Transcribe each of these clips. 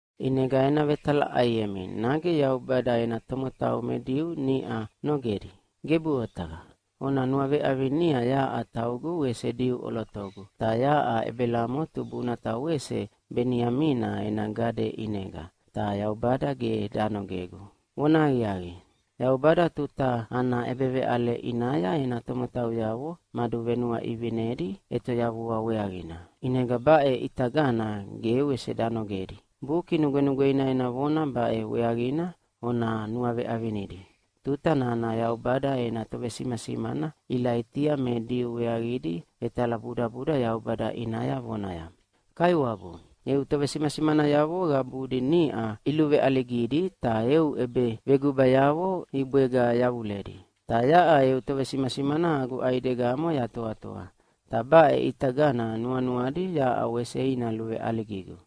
ʼInega ena vetalaʼaiemi, nage Yaubada ena tomotau me Diu niʼa nogedi? Gebuʼe otaqa! Ona nuaveʼavinia yaʼa taugu wese Diu ʼolotogu, ta yaʼa Ebelamo tubuna ta wese Beniamina ena gade ʼinega, ta Yaubada ge danogegu. Vonahaqiaqi, Yaubada tuta ana ʼebeveʼale ʼinaya ena tomotauyavo maduvenuaʼivinedi ʼetoyavua weaqina, ʼinega baʼe ʼitagana ge wese danogedi. Buki Nugwenugweina ena vona baʼe weaqina ona nuaveʼavinidi tuta nana Yaubada ena tovesimasimana Ilaitia me Diu weaqidi vetalabudabuda Yaubada ʼinaya vonaya, “Kaiwabu, eu tovesimasimanayavo qabudi niʼa iluveʼaligidi, ta eu ʼebevegubayavo ibwega yavuledi. Ta yaʼa eu tovesimasimana agu ʼaidegamo yatoatoa, ta baʼe ʼitagana nuanuadi yaʼa wese ina luveʼaligigu.”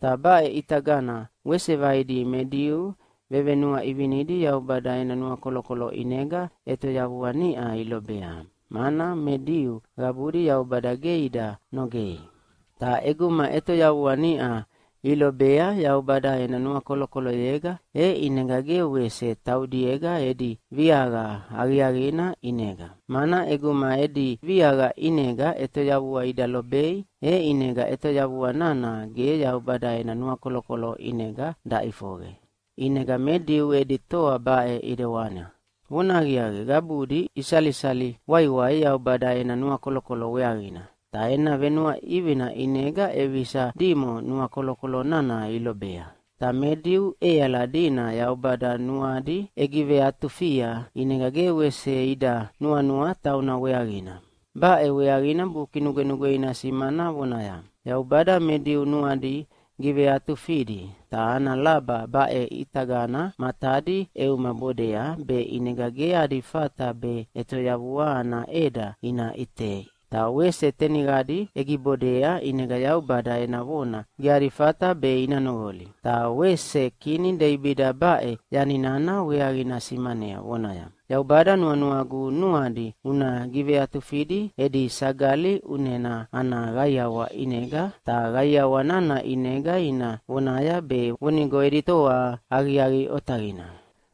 Ta baʼe ʼitagana wese vaidi me Diu vevenuaʼivinidi Yaubada ena nuakolokolo ʼinega ʼetoyavua niʼa ilobea, mana me Diu qabudi Yaubada ge ida nogei. Ta ʼeguma ʼetoyavua niʼa ilobea Yaubada ena nuakolokoloyega, e ʼinega ge wese taudiega edi viaqa aqiaqina ʼinega. Mana ʼeguma edi viaqa ʼinega ʼetoyavua ida lobei, e ʼinega ʼetoyavua nana ge Yaubada ena nuakolokolo ʼinega daʼifoqe. ʼInega me Diu edi toa baʼe ʼidewana: Vonahaqiaqi, qabudi isalisali waiwai Yaubada ena nuakolokolo weaqina, ta ena venuaʼivina ʼinega ʼevisa dimo nuakolokolo nana ilobea. Ta me Diu ʼeali dina Yaubada nuadi ʼegiveatufia, ʼinega ge wese ida nuanua tauna weaqina. Baʼe weaqina Buki Nugwenugweina simana vonaya, “Yaubada me Diu nuadi giveatufidi, ta ana laba baʼe ʼitagana matadi ʼeumabodea be ʼinega ge adi fata be ʼetoyavua ana ʼeda ina ʼitei, ta wese teniqadi ʼegibodea ʼinega Yaubada ena vona ge adi fata be ina noqoli.” Ta wese kini Deibida baʼe yani nana weaqina simanea, vonaya, “Yaubada, nuanuagu nuadi una giveatufidi edi sagali ʼunena ana qaiawa ʼinega, ta qaiawa nana ʼinega ina vonaya be vonigo edi toa aqiaqi otaqina.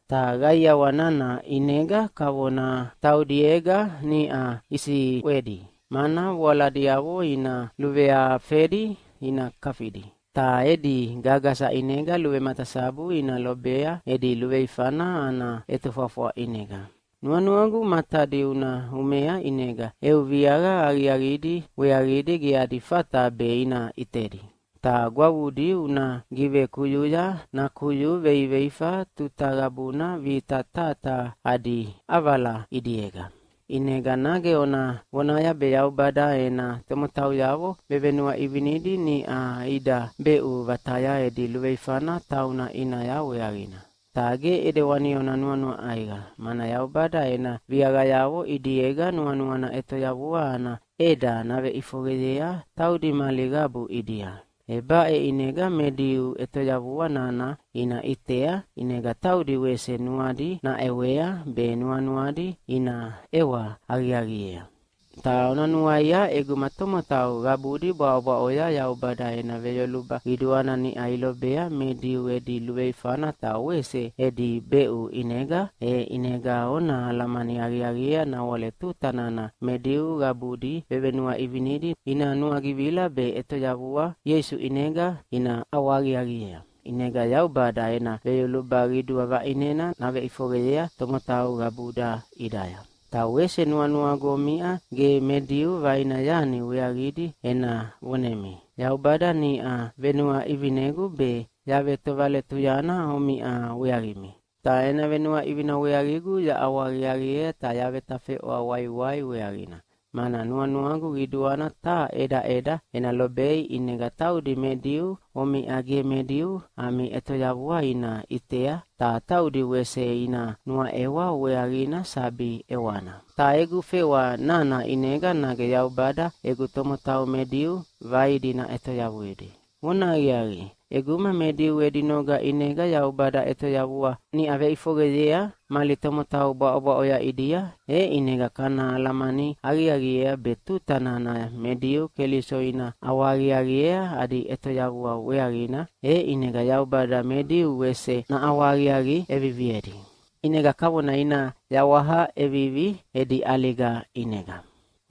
Ta qaiawa nana ʼinega kavona taudiega niʼa isiʼwedi, mana voaladiavo ina luveafedi ta ina kafidi. Ta edi gagasa ʼinega luvematasabu ina lobea edi luveifana ana ʼetofwafwa ʼinega. Nuanuagu matadi una umea ʼinega eu viaqa aqiaqidi weaqidi ge adi fata be ina ʼitedi, ta gwavudi una givekuyuya nakuyu veiveifa tuta qabuna vita taha taha adi ʼavala ʼidiega.” ʼInega nage ona vonaya be Yaubada ena tomotauyavo vevenuaʼivinidi niʼa ida beʼu vataya edi luveifana tauna ʼinaya weaqina. Ta ge ʼidewani ona nuanua ʼaiqa, mana Yaubada ena viaqayavo ʼidiega nuanuana ʼetoyavua ana ʼeda naveʼifoqeyea taudi mali qabu ʼidia. E baʼe ʼinega me Diu ʼetoyavua nana ina ʼitea, ʼinega taudi wese nuadi naʼewea be nuanuadi ina ʼewa aqiaqiea. Ta ona nuaia, ʼeguma tomotau qabudi bwaʼobwaʼoya Yaubada ena veyoluba qiduana niʼa ilobea me Diu edi luveifana ta wese edi beʼu ʼinega, e ʼinega ona alamani aqiaqiea nawale tuta nana me Diu qabudi vevenuaʼivinidi ina nuagivila be ʼetoyavua Ieisu ʼinega ina ʼawahaqiaqiea, ʼinega Yaubada ena veyoluba qidua vaʼinena naveʼifoqeyea tomotau qabuda ʼidaya. Ta wese nuanuagu omiʼa ge me Diu vaina yani weaqidi ena vonemi. Yaubada niʼa venuaʼivinegu be yavetovaletuyana omiʼa weaqimi. Ta ena venuaʼivina weaqigu yaʼawahaqiaqiea ta yavetafeʼwa waiwai weaqina, mana nuanuagu qiduana taha ʼedaʼeda ena lobei, ʼinega taudi me Diu omiʼa ge me Diu ami ʼetoyavua ina ʼitea, ta taudi wese ina nuaʼewa weaqina sabi ʼewana. Ta egu fewa nana ʼinega nage Yaubada egu tomotau me Diu vaidi naʼetoyavuidi. Vonahaqiaqi, ʼeguma me Diu edi noga ʼinega Yaubada ʼetoyavua niʼa veʼifoqeyea mali tomotau bwaʼobwaʼoya ʼidia, e ʼinega kana alamani aqiaqiea be tuta nana me Diu Keliso ina ʼawahaqiaqiea adi ʼetoyavua weaqina, e ʼinega Yaubada me Diu wese naʼawahaqiaqi ʼeviviedi. ʼInega kavona ina yawaha ʼevivi edi ʼaliga ʼinega.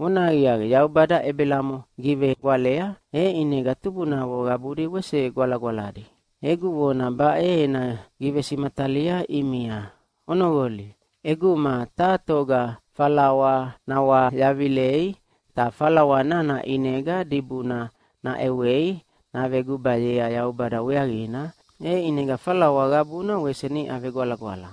Vonahaqiaqi, Yaubada Ebelamo givegwalea, e ʼinega tubunavo qabudi wese gwalagwaladi. Egu vona baʼe ena givesimatalia ʼimia, onoqolia! ʼEguma taha toga falawa nawayavilei, ta falawa nana ʼinega dibuna naʼewei navegubayea Yaubada weaqina, e ʼinega falawa qabuna wese niʼa vegwalagwala.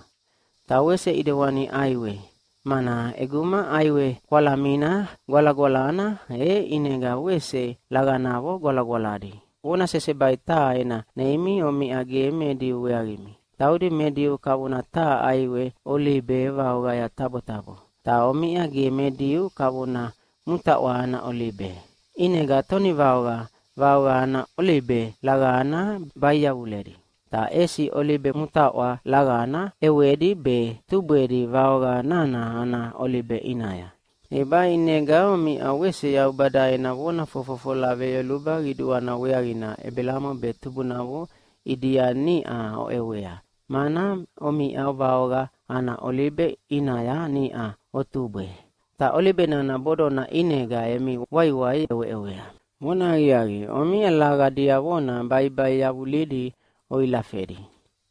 Ta wese ʼidewani ʼaiwe, mana ʼeguma ʼaiwe kwalamina gwalagwalana, e ʼinega wese laqanavo gwalagwaladi. Vona sesebai taha ena neimi omiʼa ge me Diu weaqimi. Taudi me Diu kavona taha ʼaiwe olibe vaoqaya tabotabo. Ta omiʼa ge me Diu kavona mutaʼwa ana olibe. ʼInega tonivaoqa vaoqa ana olibe laqana bai yavuledi, ta ʼesi olibe mutaʼwa laqana ʼewedi be tubwedi vaoqa nana ana olibe ʼinaya. E baʼe ʼinega omiʼa wese Yaubada ena vona fofofola veyoluba qiduana weaqina Ebelamo be tubunavo ʼidia niʼa oʼewea, mana omiʼa vaoqa ana olibe ʼinaya niʼa otubwe, ta olibe nana bodona ʼinega emi waiwai oʼeweʼewea. Vonahaqiaqi, omiʼa laqa diavona baibai yavulidi oilafedi.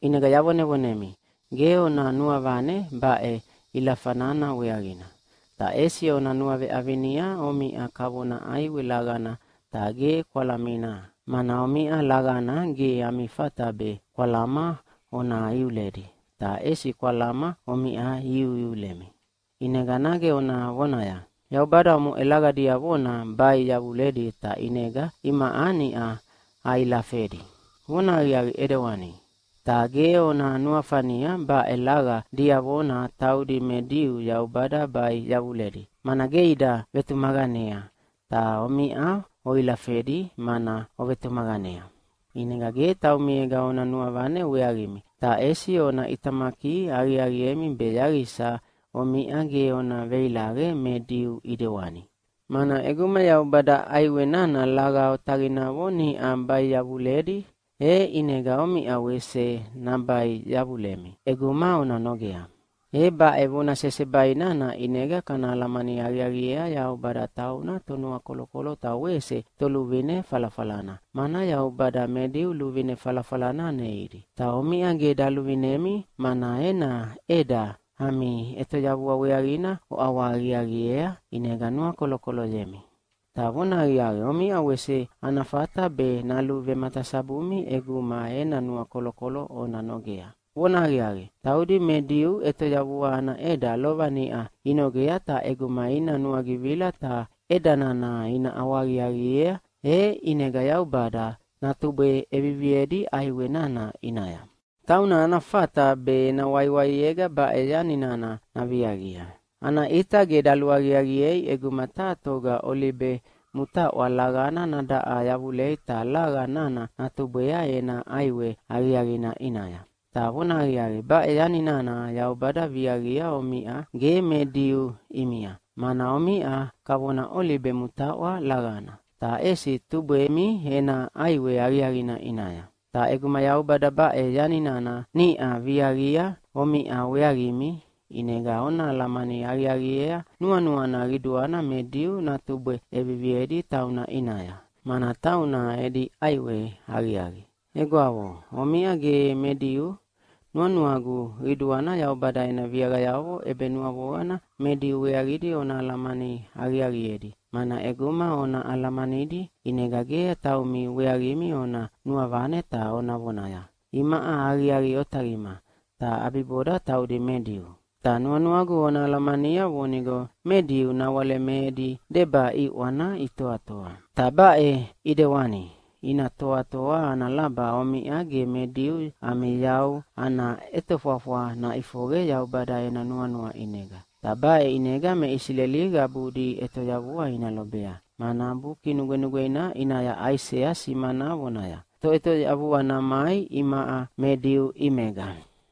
ʼInega yavonevonemi, ge ona nuavane baʼe ilafa nana weaqina. Ta ʼesi ona nuaveʼavinia omiʼa kavona ʼaiwe laqana ta ge kwalamina, mana omiʼa laqana ge ami fata be kwalama ona iuledi, ta ʼesi kwalama omiʼa iuiulemi. ʼInega nage ona vonaya, “Yaubada omoʼe laqa diavona bai yavuledi ta ʼinega imaʼa niʼa ailafedi.” Vonahaqiaqi ʼidewani, ta ge ona nuafania baʼe laqa diavona taudi me Diu Yaubada bai yavuledi, mana ge ida vetumaqanea, ta omiʼa oilafedi mana ovetumaqanea. ʼInega ge taumiega ona nuavane weaqimi, ta ʼesi ona ʼitamaki aqiaqiemi be yaqisa omiʼa ge ona veilaqe me Diu ʼidewani. Mana ʼeguma Yaubada ʼaiwe nana laqa otaqinavo niʼa bai yavuledi, e ʼinega omiʼa wese nabai yavulemi ʼeguma ona nogea. E baʼe vona sesebai nana ʼinega kana alamani aqiaqiea Yaubada tauna Tonuakolokolo ta wese Toluvine falafalana, mana Yaubada me Diu luvine falafalana neidi. Ta omiʼa ge daluvinemi, mana ena ʼeda ami ʼetoyavua weaqina oʼawahaqiaqiea, ʼinega nuakolokoloyemi. Ta vonahaqiaqi, omiʼa wese ana fata be naluvematasabumi ʼeguma ena nuakolokolo ona nogea. Vonahaqiaqi, taudi me Diu ʼetoyavua ana ʼeda lova niʼa inogea, ta ʼeguma ina nuagivila ta ʼeda nana ina ʼawahaqiaqiea, e ʼinega Yaubada natubwe ʼeviviedi ʼaiwe nana ʼinaya. Tauna ana fata be ena waiwaiega baʼe yani nana naviaqia. Ana ʼita ge daluaqiaqiei ʼeguma taha toga olibe mutaʼwa laqana nadaʼa yavulei ta laqa nana natubwea ena ʼaiwe aqiaqina ʼinaya. Ta vonahaqiaqi, baʼe yani nana Yaubada viaqia omiʼa ge me Diu ʼimia, mana omiʼa kavona olibe mutaʼwa laqana, ta ʼesi tubwemi ena ʼaiwe aqiaqina ʼinaya. Ta ʼeguma Yaubada baʼe yani nana niʼa viaqia omiʼa weaqimi, ʼinega ona alamani aqiaqiea nuanuana qiduana me Diu natubwe ʼeviviedi tauna ʼinaya, mana tauna edi ʼaiwe aqiaqi. Egwavo omiʼa ge me Diu, nuanuagu qiduana Yaubada ena viaqayavo ʼebenuavoqana me Diu weaqidi ona alamani aqiaqiedi, mana ʼeguma ona alamanidi, ʼinega ge taumi weaqimi ona nuavane ta ona vonaya, “Imaʼa aqiaqi otaqima, ta ʼabiboda taudi me Diu.” Ta nuanuagu ona alamania vonigo me Diu nawale me edi deba ʼiʼwana itoatoa. Ta baʼe ʼidewani ina toatoa ana laba omiʼa ge me Diu ami yau ana ʼetofwafwa naʼifoqe Yaubada ena nuanua ʼinega. Ta baʼe ʼinega me Isileli qabudi ʼetoyavua ina lobea, mana Buki Nugwenugweina ʼinaya Aisea simana vonaya, “Toʼetoyavua namai imaʼa me Diu ʼimega,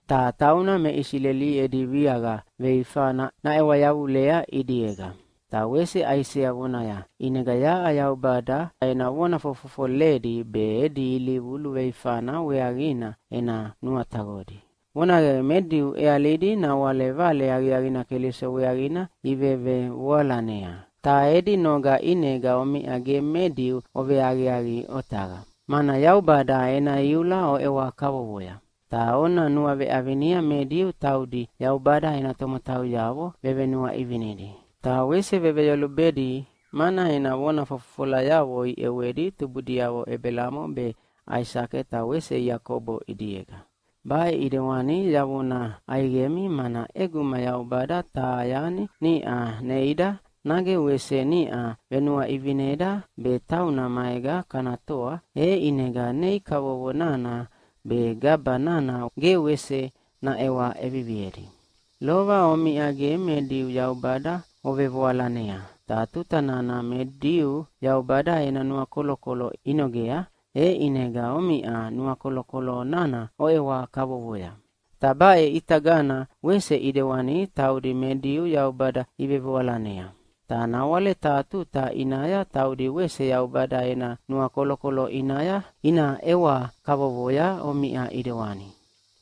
ta tauna me Isileli edi viaqa veifana naʼewa yavulea ʼidiega.” Ta wese Aisea vonaya, “ʼInega yaʼa Yaubada ena vona fofofoledi be edi ilivu luveifana weaqina ena nuataqodi.” Vonahaqiaqi, me Diu ʼealidi nawale Vale Aqiaqina Keliso weaqina ivevevoalanea. Ta edi noga ʼinega omiʼa ge me Diu oveaqiaqi otaqa, mana Yaubada ena iula oʼewa kavovoya. Ta ona nuaveʼavinia me Diu taudi Yaubada ena tomotauyavo vevenuaʼivinidi. Ta wese veveyolubedi, mana ena vona fofofolayavo iʼewedi tubudiavo Ebelamo be, Aisake ta wese Iakobo ʼidiega. Baʼe ʼidewani yavona ʼaiqemi, mana ʼeguma Yaubada taha yani niʼa neida, nage wese niʼa venuaʼivineda be tauna maega kana toa, e ʼinega nei kavovo nana be gaba nana ge wese naʼewa ʼeviviedi. Lova omiʼa ge me Diu Yaubada ovevoalanea, ta tuta nana me Diu Yaubada ena nuakolokolo inogea, e ʼinega omiʼa nuakolokolo nana oʼewa kavovoya. Ta baʼe ʼitagana wese ʼidewani taudi me Diu Yaubada ivevoalanea. Ta nawale taha tuta ʼinaya taudi wese Yaubada ena nuakolokolo ina ʼewa kavovoya omiʼa ʼidewani.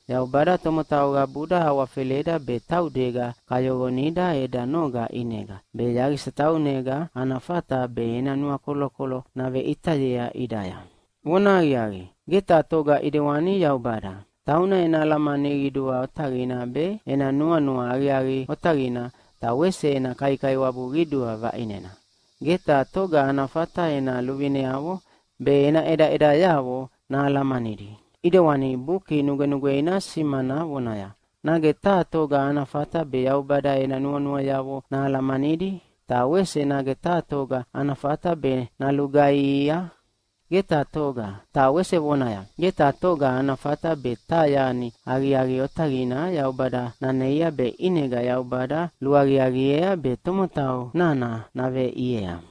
Yaubada tomotau qabuda awafeleda be taudega kayoqonida eda noga ʼinega, be yaqisa taunega ana fata be ena nuakolokolo naveʼitayea ʼidaya. Vonahaqiaqi, ge taha toga ʼidewani Yaubada! Tauna ena alamani qidua otaqina be, ena nuanua aqiaqi otaqina ta wese ena kaikaiwabu qidua vaʼinena. Ge taha toga ana fata ena luvineavo be ena ʼedaʼedayavo nahalamanidi! ʼIdewani Buki Nugwenugweina simana vonaya, “Nage taha toga ana fata be Yaubada ena nuanuayavo nahalamanidi? Ta wese nage taha toga ana fata be nalugaihia? Ge taha toga.” Ta wese vonaya, “Ge taha toga ana fata be taha yani aqiaqi otaqina Yaubada naneia be ʼinega Yaubada luaqiaqiea be tomotau nana naveʼiea.”